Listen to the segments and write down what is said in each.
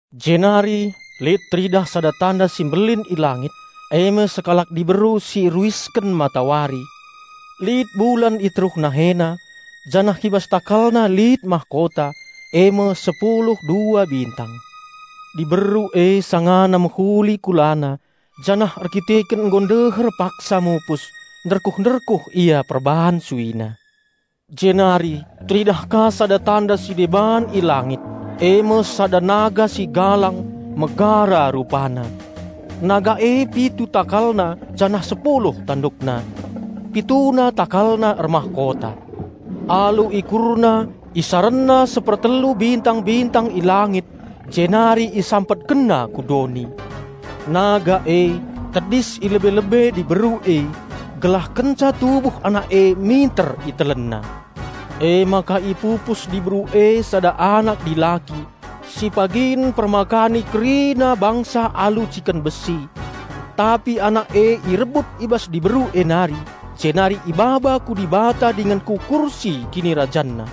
Jenari lit teridah sada tanda si mbelin i langit, eme sekalak diberu si ruisken matawari; lit bulan i teruh nahena, janah i bas takalna lit mahkota, eme sepulu dua bintang. Diberu e sanga mehuli kula, janah erkiteken nggo ndeher paksa mupus, serko-serko ia perban suina. Jenari teridah ka sada tanda si deban i langit, eme sada naga si galang, megara rupana. Naga e pitu takalna janah sepuluh tandukna. Pituna takalna ermahkota. Alu ikurna isarenna sepertelu bintang-bintang i langit jenari isampetkenna ku doni. Naga e tedis i lebe-lebe diberu e, gelah kenca tubuh anak e minter isarutina. Emaka ipupus diberu e sada anak dilaki, si pagin mpermakani kerina bangsa alu ciken besi. Tapi anak e irebut i bas diberu e nari, jenari ibaba ku Dibata dingen ku kursi KinirajanNa.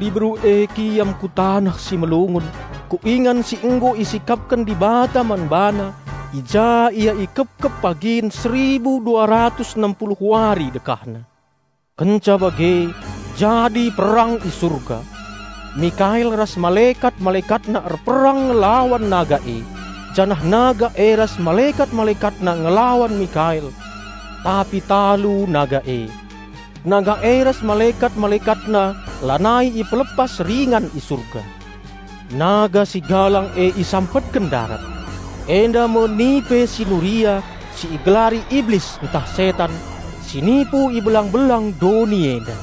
Diberu e kiam ku taneh si melungun, ku ingan si nggo isikapken Dibata man bana, i ja ia ikepkep pagin seribu dua ratus enem puluh wari dekahna. Kenca bage jadi perang i Surga. Mikael ras malekat-malekatna erperang ngelawan naga e. Janah naga e ras malekat-malekatna ngelawan Mikael, tapi talu naga e. Naga e ras malekat-malekatna lanai ipelepas ringan i Surga. Naga si galang e isampetken ndarat! Enda me nipe si nuria si igelari Iblis ntah Setan, si nipu i belang-belang doni enda.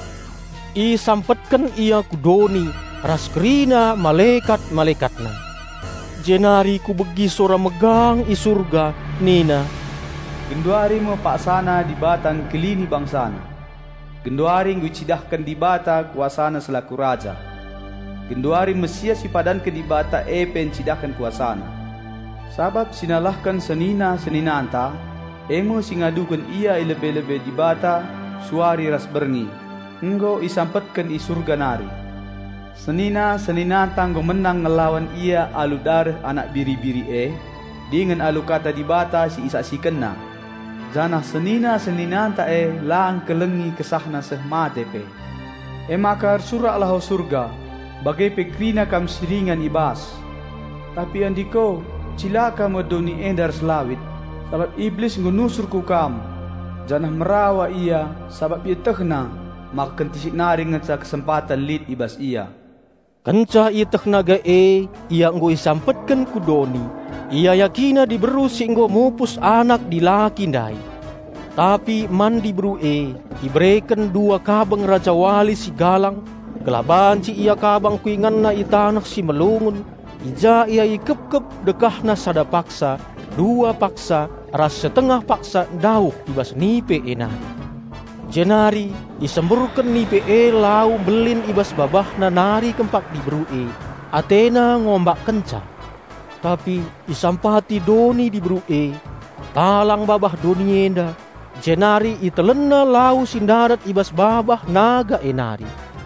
Isampetken ia ku doni ras kerina malekat-malekatna. Jenari kubegi sora megang i Surga nina, "Genduari me paksana Dibata nelamatken BangsaNa! Genduari nggo icidahken Dibata KuasaNa selaku Raja! Genduari Raja Penampat si ipadanken Dibata e pe ncidahken KuasaNa! Sabap si nalahken senina-seninanta, eme si ngaduken ia i lebe-lebe Dibata suari ras berngi nggo isampetken i Surga nari. Senina-seninanta nggo menang ngelawan ia alu dareh Anak Biri-biri e, dingen alu Kata Dibata si isaksikenna; janah senina-seninanta e la ngkelengi kesahna seh mate pe. Emaka ersuraklah o Surga, bage pe kerina kam si ringan i bas! Tapi andiko, cilaka me doni enda ras lawit, sabap Iblis nggo nusur ku kam, janah merawa ia sabap ietehna maka kentisik nari ngenca kesempaten lit i bas ia." Kenca ieteh naga e ia nggo isampetken ku doni, iayakina diberu si nggo mupus anak dilaki ndai. Tapi man diberu e ibereken dua kabeng rajawali si galang, gelah banci ia kabang ku inganna i taneh si melungun, i ja ia ikepkep dekahna sada paksa, dua paksa ras setengah paksa ndauh i bas nipe e nari. Jenari isemburken nipe e lau mbelin i bas babahna nari kempak diberu e, atena ngombakkenca. Tapi isampati doni diberu e. Talang babah doni enda, jenari itelenna lau si ndarat i bas babah naga e nari.